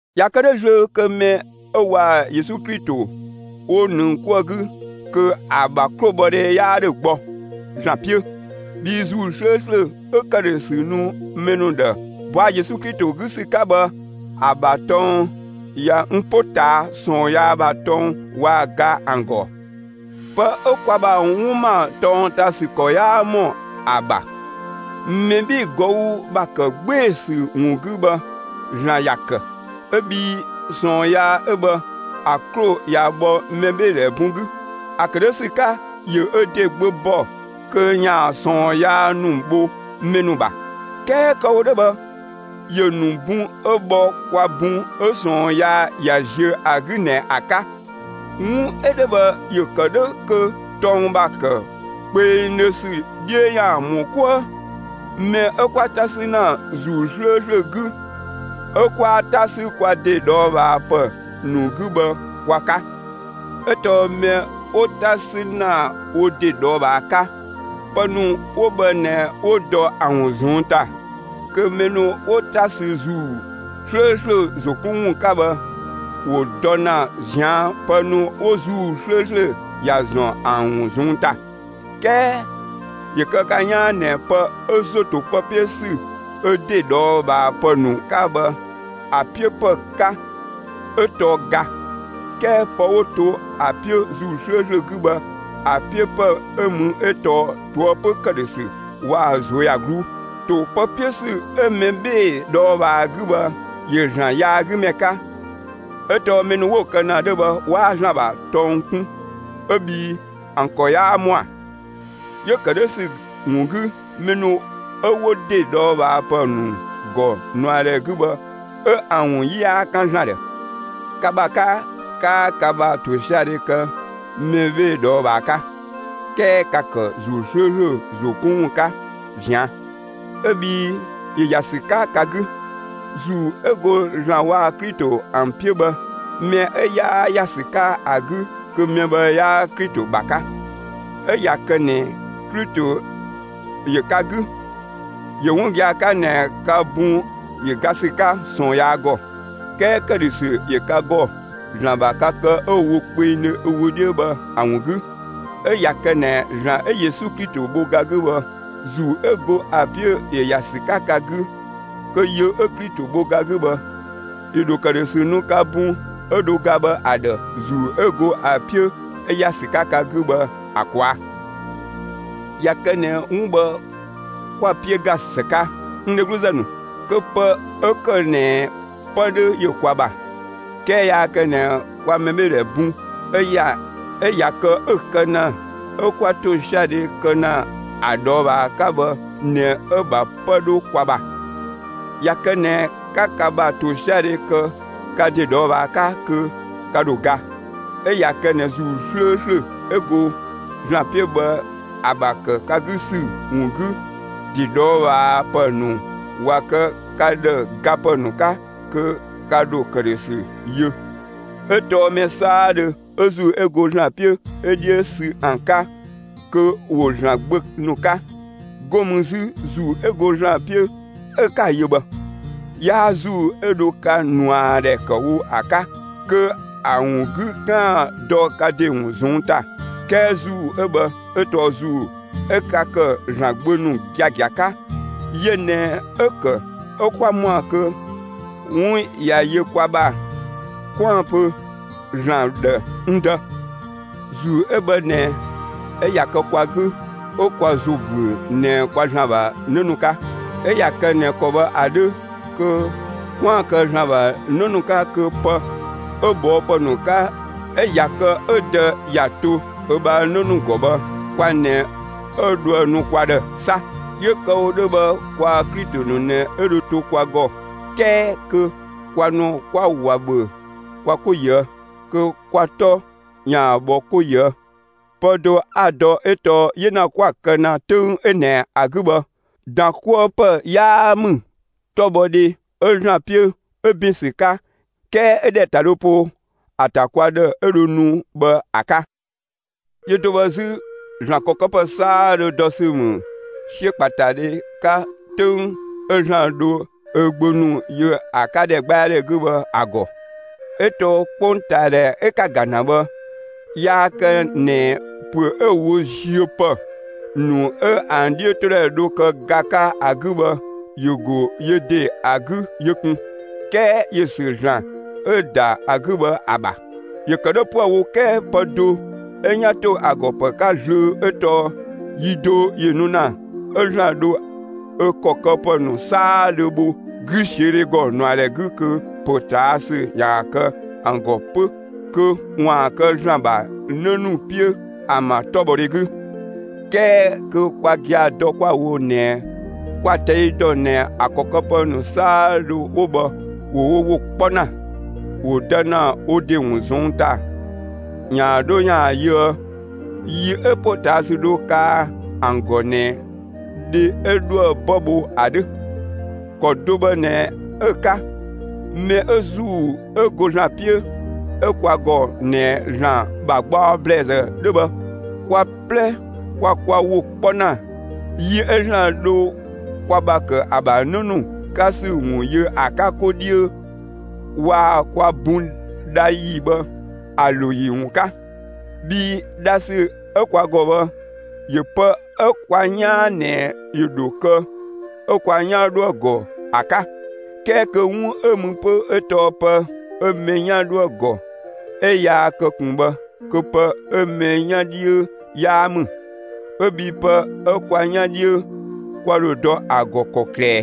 ꞊Ya kë 'dhö zlöö, kö mɛ 'ö waa‑ Yesu Klito 'wo ‑nëng 'kuë‑ 'gü, kö ‑a ‑bha 'klobhɔdhe 'yaa ‑dhö gbɔ (‑Zlan 'piö). Bhii ‑Zuu 'slööslö 'ö ‑këdhösü nu mɛ ‑nu ‑dhë ꞊bɔa' Yesu Klito 'gü ‑sü 'ka bhë, ‑a ‑bha tɔng ꞊ya n 'po ꞊taa' ꞊sɔɔn yaa ‑bha tɔng waa‑ ga ‑an ‑gɔ. Pë 'ö kwa ‑bha 'wun ‑ma tɔng ‑ta ‑sü ‑kɔ yaa ‑mɔ ‑a ‑bha, mɛ 'bhee‑ ꞊gɔü' ‑bha ‑kë 'gbee‑ ‑sü ‑wun 'gü bhë, ‑Zlan ‑ya ‑kë; 'ö bhii ꞊sɔɔn yaa 'ö bhë, ‑a 'klo ꞊ya ‑bhɔ mɛbheedhɛ ‑bun 'gü. ‑A ‑kë 'dhö ‑sü 'ka, ‑yö ö ‑de Gbö ‑bɔ kö ‑yaan ꞊sɔɔn yaa ‑nu bho mɛ ‑nu ‑bha; 'kɛɛ kë‑ wo 'dhö bhë, ‑yö ‑nu bun 'ö bhɔ kwa bun 'ö ꞊sɔɔn yaa ꞊ya ziö ‑a 'gü ꞊nɛ ‑a 'ka. 'Wun 'ö 'dhö bhë, ‑yö ‑kë 'dhö kö tɔng ‑bha ‑kë kpengdhö ‑sü 'dhiö ‑yaan ‑mɔ 'kuë mɛ 'ö 'kwa 'ta 'sü ‑na ‑Zuu 'slööslö 'gü 'ö 'kwaa 'ta 'sü kwa ‑de ꞊dhɔɔbhaapë ‑nu 'gü bhë kwa 'ka. 'Ö tɔɔ mɛ 'ö wo 'ta 'sü ‑na wo ‑de ꞊dhɔɔbhaa 'ka, pë ‑nu 'wo bhë ꞊nɛ 'wo dɔ ‑a ‑wun ꞊zɔnng' ‑ta, kö mɛ ‑nu 'wo 'ta sü ‑Zuu 'slööslö ‑zo 'kun ‑wun 'ka bhë, ‑wo dɔ ‑na ꞊zian' pë ‑nu 'wo ‑Zuu 'slööslö ‑ya ‑zɔn ‑an ‑wun ꞊zɔnng' ‑ta. ('Kɛɛ ‑yö kë ka 'yaan ꞊nɛ) pë 'ö ‑zo ‑to pë 'piö ‑sü 'ö ‑de ꞊dhɔɔbhaapë ‑nu 'ka bhë ‑a 'piö ‑pë 'ka, 'ö tɔɔ ga; 'kɛɛ pë 'wo to ‑a 'piö ‑Zuu 'slööslö 'gü bhë, ‑a 'piö ‑pë 'ö mü 'ö tɔɔ ꞊toëpö ‑këdhösü waa‑ ꞊zuöyagluu. ‑To pë 'piö ‑sü 'ö mɛ 'bhee‑ ꞊dhɔɔbhaa 'gü bhë ‑yö ‑Zlan yaagümɛ 'ka; 'ö tɔɔ mɛ ‑nu 'wo‑ kë ‑na 'dhö bhë 'waa ‑Zlan ‑bha tɔng kun 'ö bhii ‑an ‑kɔ 'yaa ‑mɔa. 'Yö‑ ‑kë 'dhö ‑sü ‑wun 'gü, mɛ ‑nu 'ö 'wo ‑de ꞊dhɔɔbhaapë ‑nu ‑gɔ ꞊nuadhɛ 'gü bhë 'ö ‑an ‑wun 'yi 'yaa 'kan ‑Zlan ‑dhë. Ka ‑bha 'ka, 'kaa ka ‑bha ‑tosiadhe kë mɛ 'bhee‑ ꞊dhɔɔbhaa 'ka, 'kɛɛ ka‑ ‑kë ‑Zuu 'slööslö ‑zo 'kun ‑wun 'ka ꞊zian' 'ö bhii ‑yö ‑ya ‑sü 'ka ka 'gü. ‑Zuu 'ö go (‑Zlan waa‑) Klito ‑an 'piö bhë, mɛ 'ö 'yaa ‑ya ‑sü 'ka ‑a 'gü, kö mɛ bhë 'yaa Klito ‑bha 'ka. 'Ö ꞊ya kë ꞊nɛ Klito ‑yö ka 'gü, ‑yö 'wun gia‑ 'ka ꞊nɛ ka bun ‑yö ga ‑sü 'ka ꞊sɔɔn yaa ‑gɔ, 'kɛɛ ‑këdhösü ‑yö ka ‑gɔ ‑Zlan ‑bha ka kë 'ö‑ wo kpengdhö ö wö 'dhiö bhë ‑a ‑wun 'gü. 'Ö ꞊ya kë ꞊nɛ ‑Zlan 'ö Yesu Klito bho ga 'gü bhë, ‑Zuu 'ö go ‑a 'piö ‑yö ‑ya ‑sü 'ka ka 'gü, kö yö 'ö Klito bho ga 'gü bhë ‑yö ‑dho ‑këdhösü nu ka bun 'ö dho ga bhë ‑a ‑dhë ‑Zuu 'ö go ‑a 'piö 'ö ‑ya ‑sü 'ka ka 'gü bhë ‑a ꞊kwaa'. ꞊Ya kë ꞊nɛ 'wun bhë 'kwa‑ 'piö ‑ga ‑së 'ka, n dhegluzë ‑nu, kö pë 'ö ‑kë ꞊nɛ 'pë 'dhö ‑yö kwa ‑bha; 'kɛɛ yaa kë ꞊nɛ kwa mɛbheedhɛ bun 'ö ꞊ya kë 'ö‑ kë ‑na 'ö 'kwa ‑tosiadhe kë ‑na ‑a ꞊dhɔɔbhaa 'ka bhë ꞊nɛ 'ö‑ ‑bha 'pë 'dhö kwa ‑bha. ꞊Ya kë ꞊nɛ ka ka ‑bha ‑tosiadhe ‑kë ka ‑de ꞊dhɔɔbhaa 'ka, kö ka ‑dho ga; 'ö ꞊ya kë ꞊nɛ ‑Zuu ('ö go ‑Zlan 'piö bhë ‑a) ‑bha ‑kë ka 'gü ‑sü ‑wun 'gü, ‑de ꞊dhɔɔbhaapë ‑nu ꞊wa kë ka ‑dhë gapë ‑nu 'ka, kö ka ‑dho ‑këdhösü yö. 'Ö tɔɔ mɛ 'saadhö 'ö ‑Zuu 'ö go ‑Zlan 'piö 'ö 'dhiö sü ‑an 'ka, kö ‑wo ‑Zlan gbö ‑nu 'ka. 'Go mü 'zü, ‑Zuu ('ö go ‑Zlan 'piö) 'ö 'ka‑ yö bhë, 'yaa ‑Zuu 'ö dho ka ꞊nuadhɛ ‑kë wo ‑a 'ka, kö ‑a ‑wun 'gü 'kaan‑ dɔ ka ‑de ‑wun ꞊zɔnng' ‑ta; 'kɛɛ ‑Zuu 'ö bhë 'ö tɔɔ ‑Zuu 'ö ka ‑kë ‑Zlan gbö ‑nu giagia 'ka. Yö ꞊nɛ 'ö‑ ‑kë 'ö 'kwa ‑mɔa kö ('wun ꞊ya yö kwa ‑bha) 'kwaan‑ pö ‑Zlan ‑dhë: «N Dë!» ‑Zuu 'ö bhë ꞊nɛ ('ö ꞊ya kë kwa 'gü) 'ö kwa ‑zo ‑büö ꞊nɛ kwa ‑Zlan ‑bha 'në ‑nu 'ka. 'Ö ꞊ya kë ꞊nɛ ‑kɔ bhë ‑a 'dhö, kö 'kwaan‑ kë ‑Zlan ‑bha 'në ‑nu 'ka kö pë 'ö ꞊bhɔɔpë ‑nu 'ka 'ö ꞊ya kë 'ö Dë ‑ya to ö ‑bha 'në ‑nu ‑gɔ bhë kwa ꞊nɛ 'ö dhoë‑ nu kwa ‑dhë 'sa. 'Yö kë‑ wo 'dhö bhë, kwaa‑ Klito ‑nu ꞊nɛ 'ö dho to kwa ‑gɔ 'kɛɛ kö kwa ‑nu 'kwa ꞊wa ‑bhö kwa 'ko ꞊yië' kö kwa 'tɔ ‑yaan bhɔ 'ko ꞊yië'. Pë do 'a‑ dɔ 'ö tɔɔ 'yena 'kwa‑ kë ‑na 'töng 'ö ꞊nɛ ‑a 'gü bhë, ‑dankuëpë 'yaa ‑mü 'tɔbhɔdhe ('ö ‑Zlan 'piö) 'ö ‑bin ‑sü 'ka 'kɛɛ ö ‑dhɛ ‑ta dhö po ‑a ‑ta kwa ‑dhë 'ö dho nu bhë ‑a 'ka. Yö do bhë 'zü, ‑Zlan ‑kɔ këpë 'saadhö dɔ ‑sü ‑mü 'siökpaatadhe 'ka 'töng 'ö ‑Zlan dho ö gbö ‑nu yö ‑a 'ka ‑dhɛgbɛadhɛ 'gü bhë ‑a ‑gɔ. 'Ö tɔɔ 'kpongtaadhɛ 'ö 'ka‑ ‑ga ‑na bhë, yaa kë ꞊nɛ ‑püö 'ö‑ wo ziö ‑pë ‑nu 'ö ‑an 'dhiötodhɛ dho kë ga 'ka ‑a 'gü bhë, ‑yö ‑go yö ‑de ‑a 'gü yö ꞊kun, 'kɛɛ ‑yö ‑sü ‑Zlan 'ö‑ ‑da ‑a 'gü bhë ‑a ‑bha. ‑Yö ‑kë 'dhö 'püë‑ wo 'kɛɛ pë do 'ö 'yan ‑to ‑a ‑gɔ ‑pë 'ka zlöö 'ö tɔɔ: Yi do ‑yö nu ‑na, 'ö ‑Zlan dho ö ‑kɔ këpë ‑nu 'saadhö bho 'güsiödhe ‑gɔ ꞊nuadhɛ 'gü kö ‑potaasü ‑yaan kë ‑an ‑gɔ 'pö kö ‑waan kë ‑Zlan ‑bha 'në ‑nu 'piö ‑an ‑bha 'tɔbhɔdhe 'gü. 'Kɛɛ kö kwa gia‑ dɔ 'kwa‑ wo ꞊nɛ kwa‑ ꞊tɛi' ‑dɔ ꞊nɛ ‑a ‑kɔ këpë ‑nu 'saadhö 'wo bhë ‑wo wo ‑wo 'kpɔ ‑na, ‑wo dɔ ‑na wo ‑de ‑wun ꞊zɔnng' ‑ta ‑yaan 'dho ‑yaan yöë yi 'ö ‑potaasü dho kaa ‑an ‑gɔ ꞊nɛ dhe 'ö 'dhoë‑ 'bë bho ‑a 'dhö. ‑Kɔ do bhë ꞊nɛ 'ö‑ 'ka. Mɛ 'ö ‑Zuu 'ö go ‑Zlan 'piö 'ö kwa ‑gɔ ꞊nɛ ‑Zlan ‑bha gbaɔ ‑blɛɛzë 'dhö bhë, kwa 'plɛ kwa kwa ‑wo 'kpɔ ‑na, yi 'ö ‑Zlan dho kwa ‑bha ‑kë ‑a ‑bha 'në ‑nu 'ka ‑sü ‑wun yö ‑a 'ka 'ko 'dhiö, waa‑ kwa bun dha ‑yi bhë ‑a ‑lo ‑yi ‑wun 'ka. Bhii dhasü 'ö kwa ‑gɔ bhë ‑yö pë 'ö kwa 'yaan ꞊nɛ ‑yö ‑dho kë 'ö kwa 'yan 'dhoë‑ ‑gɔ ‑a 'ka. 'Kɛɛ kö 'wun 'ö mü 'pö 'ö tɔɔ pë 'ö mɛ 'yan 'dhoë‑ ‑gɔ 'ö yaa kë ꞊kun bhë kö pë 'ö mɛ 'yan 'dhiö 'yaa ‑mü 'ö bhii pë 'ö kwa 'yan 'dhiö, kwa ‑dho dɔ ‑a ‑gɔ ‑kɔklë ꞊ɛɛ?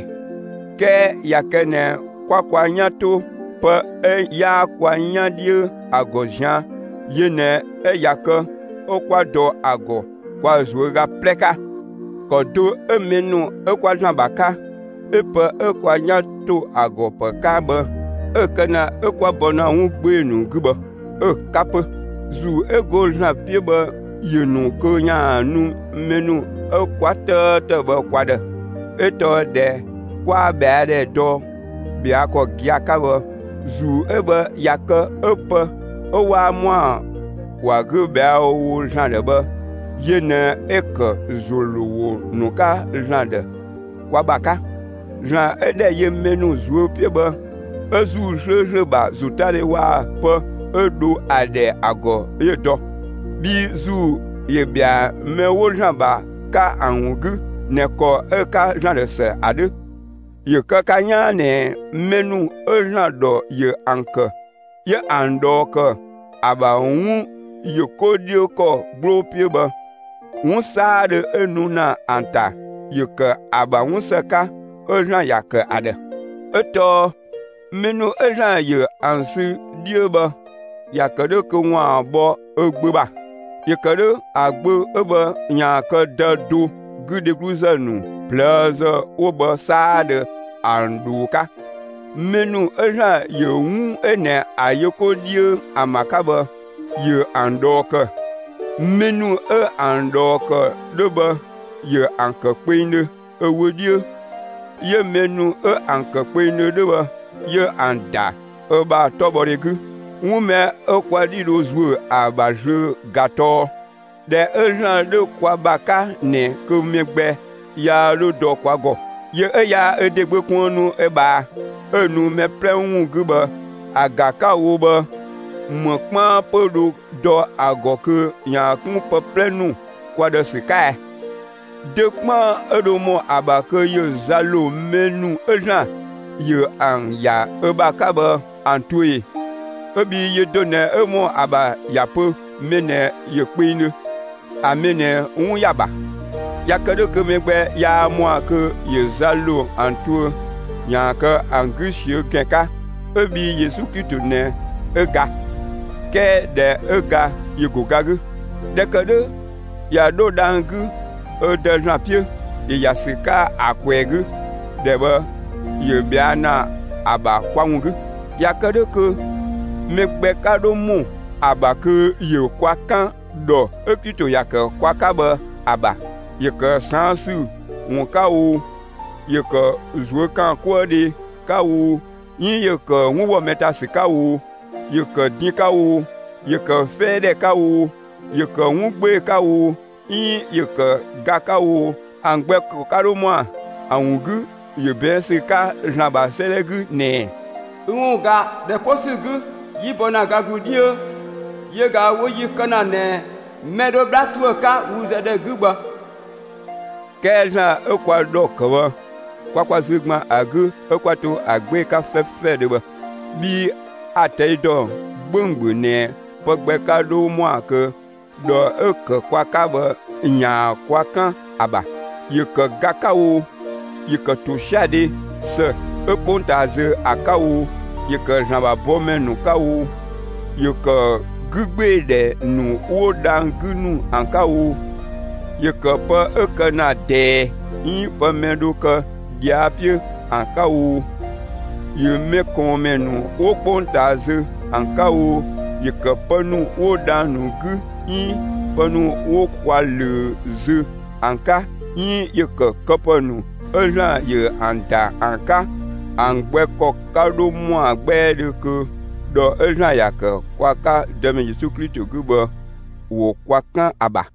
'Kɛɛ ꞊ya kë ꞊nɛ 'kwa kwa 'yan 'to pë 'ö 'yaa kwa 'yan 'dhiö ‑a ‑gɔ zian‑, yö ꞊nɛ 'ö ꞊ya kë 'ö 'kwa dɔ ‑a ‑gɔ kwa ꞊zuöga 'plɛ 'ka. ‑Kɔ do 'ö mɛ ‑nu 'ö 'kwa ‑Zlan ‑bha 'ka 'ö pë 'ö 'yan ‑to ‑a ‑gɔ ‑pë 'ka bhë 'ö‑ kë ‑na 'ö kwa bɔ ‑na 'wun 'gbee‑ ‑nu 'gü bhë, 'ö‑ 'ka 'pö; ‑Zuu 'ö go ‑Zlan 'piö bhë ‑yö ‑nu kö ‑yaan nu mɛ ‑nu 'ö 'kwa 'tëëtë bhë kwa ‑dhë. 'Ö tɔɔ ꞊dhɛ 'kwaa ꞊bhɛa' ‑dhɛ dɔ ꞊bhɛa' ‑kɔ gia‑ 'ka bhë, ‑Zuu 'ö bhë ꞊ya kë 'ö pë 'ö 'waa ‑mɔa ‑wa 'gü ꞊bhɛa'‑ wo ‑Zlan ‑dhë bhë, yö ꞊nɛ 'ö ‑kë ‑zo ‑lo ‑wo ‑nu 'ka ‑Zlan ‑dhë kwa ‑bha 'ka. ‑Zlan 'ö ‑dhɛ yö mɛ ‑nu ꞊zuö' 'piö bhë, 'ö ‑Zuu 'slööslö ‑bha ‑zotadhe waa‑ pë 'ö dho ‑a ‑dhɛ ‑a ‑gɔ 'yö‑ dɔ; bhii ‑Zuu ‑yö ‑bhɛa mɛ 'wo ‑Zlan ‑bha 'ka ‑an ‑wun 'gü ꞊nɛ ‑kɔ 'ö‑ 'ka ‑Zlan ‑dhë ‑së ‑a 'dhö. ‑Yö kë ka 'yaan ꞊nɛ mɛ ‑nu 'ö ‑Zlan ‑dhɔ ‑yö ‑an ‑kë 'ö ‑an ꞊dhɔɔ ‑kë ‑a ‑bha 'wun ‑yö 'ko 'dhiö ‑kɔ 'gbloo 'piö bhë, 'wun 'saadhö 'ö nu ‑na ‑an ‑ta, ‑yö ‑kë ‑an ‑bha 'wun ‑së 'ka ('ö ‑Zlan ‑ya kë ‑an ‑dhë). 'Ö tɔɔ mɛ ‑nu 'ö ‑Zlan ‑yö ‑an sü 'dhiö bhë, ‑ya ‑kë 'dhö kö ‑waan bhɔ ö Gbö ‑bha; ‑yö kë 'dhö ‑a Gbö 'ö bhë ‑yaan kë Dë do 'gü dhegluzë ‑nu ꞊plëëzë 'wo bhë 'saadhö, ‑an ꞊dhoo 'ka. Mɛ ‑nu 'ö ‑Zlan ‑yö 'wun 'ö ꞊nɛ ‑a yö 'ko 'dhiö ‑an ‑bha 'ka bhë, ‑yö ‑an ꞊dhɔɔ ‑kë; mɛ ‑nu 'ö ‑an ꞊dhɔɔ ‑kë 'dhö bhë, ‑yö ‑an ‑kë kpengdhö ö wö 'dhiö; 'yö mɛ ‑nu 'ö ‑an ‑kë kpengdhö 'dhö bhë, 'yö ‑an ‑da ö ‑bha 'tɔbhɔdhe 'gü. 'Wun mɛ 'ö kwa 'dhi dho ‑zuö ‑a ‑bha zlöö ꞊ga tɔɔ: ꞊Dhɛ 'ö ‑Zlan 'dhö kwa ‑bha 'ka ꞊nɛ, kö mɛ gbɛ yaa 'dho dɔ kwa ‑gɔ. Yö 'ö yaa ö ‑de Gbö kuënnu ö ꞊bhaa, 'ö‑ nu mɛ 'plɛ ‑wun 'gü bhë, ‑a ga 'ka‑ wo bhë ‑më 'kpaan 'pö dho dɔ ‑a ‑gɔ kö ‑yaan 'kun pë 'plɛ ‑nu kwa ‑dhë ‑sü 'ka ɛɛ? Dö 'kpaan 'ö dho ‑mɔ ‑a ‑bha kö ‑yö za ‑lo mɛ ‑nu 'ö ‑Zlan ‑yö ‑an ‑ya ö ‑bha 'ka bhë ‑an tuö ee, 'ö bhii yö do ꞊nɛ 'ö ‑mɔ ‑a ‑bha ‑ya pö mɛ ꞊nɛ ‑yö kpengdhö, (‑a mɛ ꞊nɛ 'wun ‑ya ‑bha). ꞊Ya kë 'dhö kö mɛ gbɛ 'yaa ‑mɔa kö ‑yö za ‑lo ‑an tuö ‑yaan kë ‑an 'gü ꞊siö' ‑gɛn 'ka 'ö bhii Yesu Klito ꞊nɛ 'ö ga; 'kɛɛ ꞊dhɛ 'ö ga, ‑yö ‑go ga 'gü. ꞊Dhɛ ‑kë 'dhö ꞊ya 'dho dhang‑ 'gü ö Dë ‑Zlan 'piö; ‑yö ‑ya ‑sü 'ka ‑a ꞊kwɛɛ‑ 'gü; ‑dhɛ bhë ‑yö ꞊bhɛa' ‑na ‑a ‑bha kwa ‑wun 'gü. (꞊Ya kë 'dhö kö) mɛ gbɛ 'ka 'dho ‑mɔ ‑a ‑bha kö ‑yö kwa 'kan ‑dhɔ 'ö Klito ‑ya ‑kë kwa 'ka bhë ‑a ‑bha; ‑yö ‑kë ꞊saan ‑sü ‑wun 'ka oo, ‑yö ‑kë ꞊zuökaankuëdhe 'ka oo, 'iin ‑yö ‑kë 'wun ‑wɔ mɛ ‑ta sü 'ka oo, ‑yö ‑kë din 'ka oo, ‑yö ‑kë 'fɛɛdhɛ 'ka oo, ‑yö ‑kë 'wun 'gbee‑ 'ka oo, 'iin ‑yö ‑kë ga 'ka oo, ‑an gbɛ ‑kɔ 'ka 'dho ‑mɔa. ‑A ‑wun 'gü, ‑yö ꞊bɛɛn' ‑sü 'ka ‑Zlan ‑bha 'sëëdhɛ 'gü ꞊nɛ: Ü ‑wun ꞊ga, ‑dhɛ 'po ‑sü 'gü, 'yi bɔ ‑na ga ‑glu 'dhiö, yö ꞊ga 'wo yi kë ‑na ꞊nɛ mɛ dho 'bhla ‑tuë 'ka wü zë ‑dhɛ 'gü bhë. 'Kɛɛ ‑Zlan 'ö kwa ‑dhɔ ‑kë bhë, kwa kwa zü ‑gban ‑a 'gü 'ö 'kwa to ‑a 'gbee‑ 'ka 'fɛfɛdhö bhë. Bhii a‑ ꞊tɛi' ‑dɔ 'gbönggböng ꞊nɛ pë gbɛ 'ka 'dho ‑mɔa kö ‑dhɔ 'ö‑ ‑kë kwa 'ka bhë ‑yaan kwa 'kan ‑a ‑bha. ‑Yö ‑kë ga 'ka oo, ‑yö ‑kë ‑tosiadhe (‑së 'ö 'kpongtaa zö ‑a) 'ka oo, ‑yö ‑kë ‑Zlan ‑bha bɔmɛ ‑nu 'ka oo, ‑yö ‑kë 'gügbeedhɛ ‑nu 'wo dhang‑ 'gü ‑nu ‑an 'ka oo, ‑yö ‑kë pë 'ö kë ‑na ꞊dɛɛ 'iin pë mɛ dho kë ꞊dhia' 'piö ‑an 'ka oo, ‑yö mɛkɔɔnmɛ ‑nu 'wo 'kpongtaa zö ‑an 'ka oo, ‑yö ‑kë pë ‑nu 'wo dhang‑ ‑nu 'gü 'iin pë ‑nu 'wo kwa ꞊löö zö ‑an 'ka 'iin ‑yö ‑kë këpë ‑nu 'ö ‑Zlan ‑yö ‑an ‑da ‑an 'ka, ‑an gbɛ ‑kɔ 'ka 'dho ‑mɔa 'gbɛɛdhö kö ‑dhɔ 'ö ‑Zlan ‑ya ‑kë kwa 'ka kwa Dëmɛ Yesu Klito 'gü bhë, ‑wo kwa 'kan ‑a ‑bha.